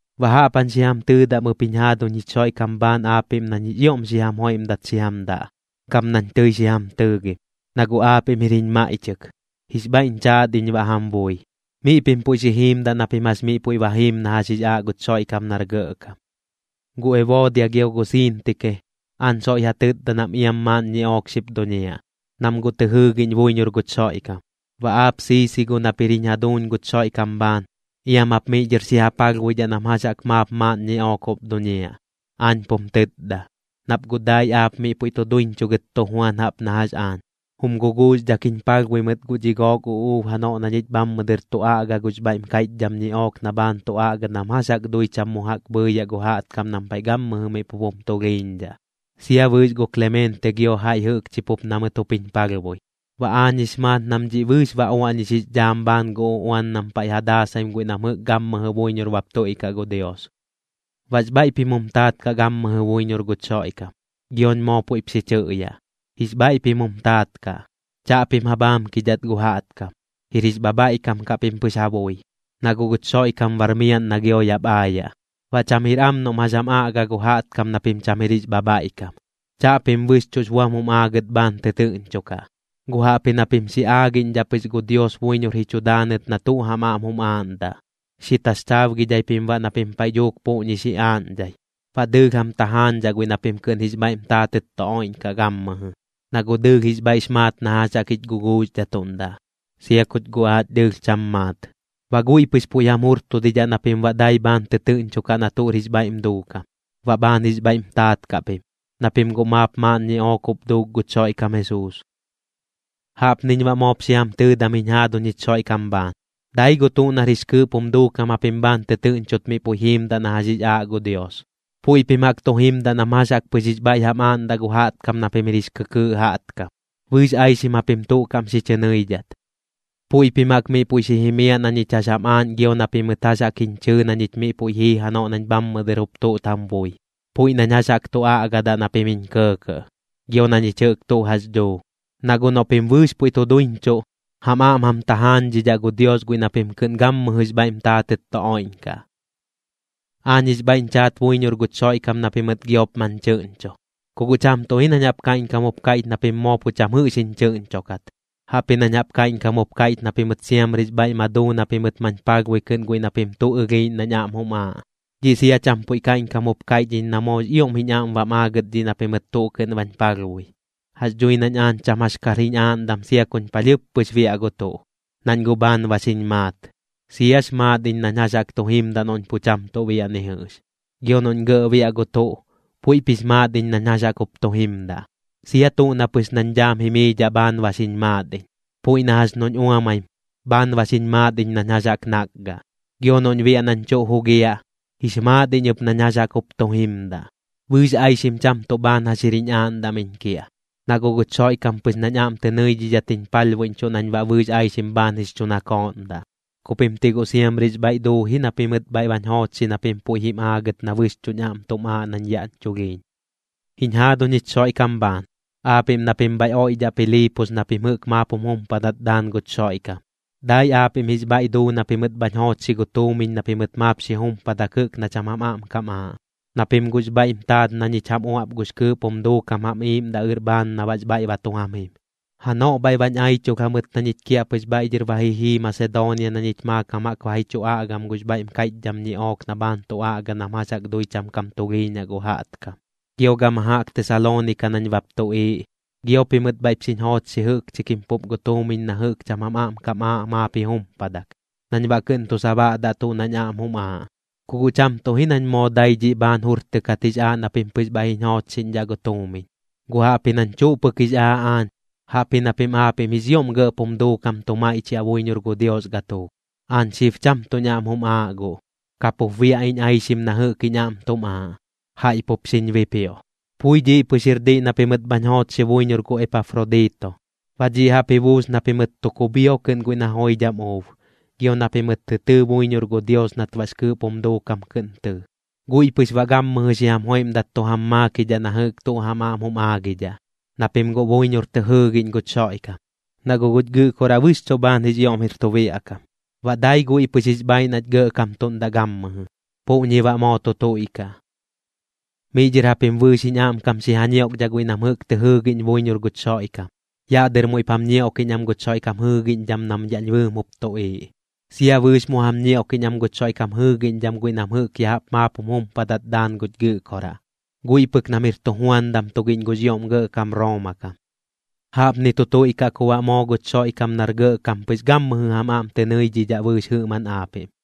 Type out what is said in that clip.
Baꞌ jaꞌp jañ xi jam tɨɨdam ɨp jiñ jaaduñ jich Xoiꞌkam bhaan aapiꞌm nañ jix ioꞌm xi jam joiꞌmdat xi jam daꞌ, gam nañ tɨi xi jam tɨɨgim. Na guꞌ aapiꞌm jir jiñ maiꞌchɨk, jix bhaiꞌñ chaat iñ baꞌ jam bui. Miꞌ pim puiꞌ xi jiimdaꞌ na pim jax miꞌ puiꞌ ba jiim na jax jix aaꞌ guch Xoiꞌkam nar gɇꞌkam. Gu Eboodia gio gu Siintike, aañ soiꞌ ja tɨtda nam iam maaꞌn ñiꞌook xip duñiaꞌ, nam guꞌ tɨ jɨɨgiꞌñ buiñor guch Xoiꞌkam. Baꞌ aap Siisigo nap jir jiñ jaduuñ guch Xoiꞌkam bhaan, iam jap miꞌ dhɨr xi ja palhbuidhaꞌ nam jax jaꞌk maap maaꞌn ñiꞌook jup duñiaꞌ, aañ pum tɨtda, nap guꞌ dai aap miꞌ puiꞌ duiñchuꞌ gɨt tu juan jaꞌp na jax aañ. Jum guguuxdhak jiñ palhbui mɨt guꞌ dhi gook uꞌuub janoꞌ na ñich bhammɨ dɨr tu aꞌga gux bhaiꞌm kaiꞌchdham ñiꞌook na bhaan tu aꞌga nam jax jaꞌk dui cham mu jaꞌk bhɨɨyaꞌ gu jaꞌtkam nam paiꞌ gammɨjɨ miꞌ pup jum tulhiiñdhaꞌ. Sia bɨɨx gu Klemeente gio jaiꞌ jɨꞌkchi pup na mɨt jup jiñ palhbui, baꞌ aañ jix maat nam dhiꞌ bɨɨx ba uaꞌñix jix dhaam bhaan gu uꞌuan nam paiꞌ ja daasaim guiꞌ nam jɨꞌk gammɨjɨ buiñor bap tuiꞌkaꞌ gu Dios. Baꞌx bhaiꞌ pim jum taat kaꞌ gammɨjɨ buiñor guch Xoiꞌkam. Gioñ moo puiꞌp xi chɨꞌyaꞌ: Jix bhaiꞌ pim jum taat kaꞌ. Chaꞌpim ja bhaamkidhat gu jaꞌtkam, jir jix bhabhaiꞌkam kaꞌ pim pɨx ja bui. Na guꞌ guch Xoiꞌkam bar miaꞌn na gio yaꞌp aayaꞌ, baꞌ cham jir am noꞌm jax jam aꞌga gu jaꞌtkam na pim cham jir jix bhabhaiꞌkam. Chaꞌpim bɨxchuꞌx buam jum aagɨt bhaan tɨtɨɨꞌñchokaꞌ, guꞌ jaꞌpji na pim xi aagiꞌñdhaꞌ pɨx gu Dios buiñor ji chu daanɨt na tuꞌ jam aꞌm jum aaꞌndaꞌ. Xi taxchaabgidhai pim baꞌ na pim paiꞌ dhuuk puꞌñi xi aaꞌñdhai. Baꞌ dɨɨlh jam tajaañdhaꞌ guiꞌ na pim kɨꞌn jix bhaiꞌm taatɨt tu oiꞌñkaꞌ gammɨjɨ, na guꞌ dɨɨlh jix bhaiꞌx maat na jax jaꞌk jich guguuxdhatuꞌndaꞌ, sia kuch guꞌ aach dɨɨlh cham maat. Baꞌ guiꞌ pɨx puiꞌ jam jurtudidhaꞌ na pim baꞌ dai bhaan tɨtɨɨꞌñchokaꞌ na tuꞌr jix bhaiꞌm duukam, baꞌ bhaan jix bhaiꞌm taat kaꞌ pim, na pim guꞌ maap maaꞌn ñiꞌook jup duuk guch Xoiꞌkam Jesuus. Jaꞌpniñ baꞌ moop xi jam tɨɨdam jiñ jaaduñ jich Xoiꞌkam bhaan. Dai gu tuꞌ nar jix kɨɨꞌp jum duukam japim bhaan tɨtɨɨꞌñchot miꞌ puiꞌ jiimdaꞌ na jax jix aaꞌ gu Dios. Puiꞌ pim jaꞌk tu jimdaꞌ nam jax jaꞌk pɨx jix bhaiꞌ jam aaꞌndaꞌ gu jaꞌtkam na pim jir jix kɨkɨɨꞌ jaꞌtkam. Bɨɨx aixim japim tuꞌ kaꞌm xi chɨ nɨidhat. Puiꞌ pim jaꞌk miꞌ puiꞌ xi jimiaꞌ na ñich jax jam aaꞌñ gio na pimɨt jax jaꞌk jiñ chɨɨ na ñich miꞌ puiꞌ jii janoꞌ nañ bhammɨ dɨr jup tuꞌt jam bui, puiꞌ nañ jax jaꞌk tu aꞌgadaꞌ na pim jiñ kɇɇkɇꞌ, gio na ñich jɨꞌk tuꞌ jax dhuu. Na guꞌ noꞌ pim bɨɨx puiꞌ tu duiñchuꞌ, jam aꞌm jam tajaañdhidhaꞌ gu Dios guiꞌ na pim kɨꞌn gammɨjɨx bhaiꞌm taatɨt tu oiꞌñkaꞌ. Aañ jix bhaiꞌñ chaat buiñor guch Xoiꞌkam na pimɨt giop mañ chɨꞌñcho. Ku guꞌ cham tuꞌ ji nañ jaꞌp kaiꞌñkam jup kaiꞌch na pim moo pu cham jɨꞌx jiñ chɨꞌñchokat, jaꞌpji nañ jaꞌp kaiꞌñkam jup kaiꞌch na pimɨt siamrix bhaiꞌ ma duu na pimɨt mañ palhbui kɨꞌn guiꞌ na pim tuꞌ ɨlhiiꞌñ nañ aꞌm jum aaꞌ. Dhiꞌ sia cham puiꞌ kaiꞌñkam jup kaiꞌch iñ na moox ioꞌm jiñ aꞌm bam aagɨt dhiꞌ na pimɨt tuꞌ kɨꞌn bañ palhbui. Jax dhui nañ aañ cham jax kar jiñ aaꞌndam sia kuñ palhɨɨp pɨx biaꞌ gu tuꞌ, nañ guꞌ bhaan ba xiñ maat. Siax maat iñ nañ jax jaꞌk tu jimdaꞌ noꞌñ pu cham tuꞌ biaꞌ ni jɨꞌx, gio noꞌñ gɇꞌ biaꞌ gu tuꞌ, puiꞌp jix maat iñ nañ jax jaꞌk jup tu jimdaꞌ. Sia tuꞌ na pɨx nañ dhaam jimiidhaꞌ bhaan ba xiñ maat iñ. Puiꞌ na jax noꞌñ uamaim, bhaan ba xiñ maat iñ nañ jax jaꞌk nakgaꞌ. Gio noꞌñ biaꞌ nañ tuꞌ jugiaꞌ, jix maat iñ ɨp nañ jax jaꞌk jup tu jimdaꞌ. Bɨɨx aixim cham tuꞌ bhaan jax jir jiñ aaꞌndam iñ kiaꞌ, na guꞌ guch Xoiꞌkam pɨx nañ aꞌm tɨ nɨidhidhat jiñ palhbuiꞌñchuꞌ nañ baꞌ bɨɨx aixim bhaan jix chu nakooꞌndaꞌ. Ku pim ti guꞌ siamrix bhaiꞌ duu ji na pimɨt bhaiꞌ bañ joochxi na pim puiꞌ jim aagɨt na bɨxchuꞌñ aꞌm tum aaꞌ nañ yaꞌñ chulhiiñ. Jiñ jaaduñ jich Xoiꞌkam bhaan, aapiꞌm na pim bhaiꞌ oiꞌdhaꞌ Piliipos na pim jɨꞌk maap jum jumpadat daan guch Xoiꞌkam, dai aapiꞌm jix bhaiꞌ duu na pimɨt bhañ joochxi gu tuumiñ na pimɨt maap xi jumpadak jɨꞌk na cham jam aꞌm kam aaꞌ, na pim guꞌx bhaiꞌm taat na ñich jam uaꞌp gux kɨɨꞌp jum duukam jam iꞌiiꞌmdaꞌ ɨr bhaan na baꞌx bhaiꞌ ba tu jam jim. Janoꞌ bhaiꞌ bañ aichulh jamɨt na ñich kiaꞌpɨx bhaiꞌ dhɨr ba ji jii Masedoonia na ñich maakam jaꞌk ba ji chu aꞌgam gux bhaiꞌm kaiꞌchdham ñiꞌook na bhaan tu aꞌga nam jax jaꞌk dui cham kam tulhiiñaꞌ gu jaꞌtkam. Gio gama jaꞌk Tesaloonika nañ bap tuꞌiiꞌ, gio pimɨt bhaiꞌp xiñ joochxi jɨꞌkchi kim pup gu tuumiñ na jɨꞌk cham jam aꞌm kam aaꞌ maap ji jumpadak, nañ baꞌ kɨꞌn tu sabaꞌdaꞌ tuꞌ nañ aꞌm jum aaꞌ. Ku guꞌ cham tuꞌ ji nañ moo dai dhiꞌ bhaan jurtɨkat jix aaꞌ na pim pɨx bhaiꞌ jiñ joochxiꞌñdhaꞌ gu tuumiñ, guꞌ jaꞌpji nañ tuꞌ pɨk jix aaꞌ aañ, jaꞌpji na pim aapiꞌm jix ioꞌm gɇꞌp jum duukam tu maiꞌchiaꞌ buiñor gu Dios gatuuk. Aañ xib cham tuꞌñ aꞌm jum aaꞌ guꞌ, kapup biaꞌ iñ aixim na jɨꞌk jiñ aꞌm tum aaꞌ, jaiꞌ pup xiñ bipioꞌ. Pui dhiꞌ pɨx jir diꞌ na pimɨt bhañ joochxi buiñor gu Epafrodito. Baꞌ dhiꞌ jaꞌp ji buus na pimɨt tu kubhio kɨꞌn guiꞌ na joidham uub, gio na pimɨt tɨ tɨɨ buiñor gu Dios nat baꞌx kɨɨꞌp jum duukam kɨꞌn tɨɨ. Guiꞌ pɨx baꞌ gammɨjɨ xi jam joiꞌmdat tu jam maakidhaꞌ na jɨꞌk tuꞌ jam aꞌm jum aagidhaꞌ, na pim guꞌ buiñor tɨ jɨɨgiꞌñ guch Xoiꞌkam. Na guꞌ guch Gɨꞌkoraꞌ bɨxchuꞌ bhaan jix ioꞌm jir tu biaꞌ kam, baꞌ dai guiꞌ pɨx jix bhaiꞌ nach gɇꞌkamtuꞌndaꞌ gammɨjɨ. Puꞌñi baꞌ moo tu tuiꞌkaꞌ. Miꞌ dhɨr japim bɨɨx jiñ aꞌmkam xi ja ñioꞌkdhaꞌ guiꞌ nam jɨꞌk tɨ jɨɨgiꞌñ buiñor guch Xoiꞌkam. Yaꞌ dɨr muiꞌp jam ñioꞌkiꞌñ am guch Xoiꞌkam jɨɨgiꞌñdham nam yaꞌñ bɨɨm jup tuꞌiiꞌ. Sia bɨɨx mu jam ñioꞌkiꞌñ am guch Xoiꞌkam jɨɨgiꞌñdham guiꞌ nam jɨꞌk ya jaꞌp maap jum jumpadat daan guch Gɨꞌkoraꞌ, guiꞌ pɨk nam jir tujuandam tugiꞌñ gux ioꞌm gɇꞌkam Rooma kam. Jaꞌpni tu tuiꞌkaꞌ ku baꞌ moo guch Xoiꞌkam nar gɇꞌkam pɨx gammɨjɨ jam aꞌm tɨ nɨidhidhaꞌ bɨɨx jɨꞌmaꞌn aapiꞌm.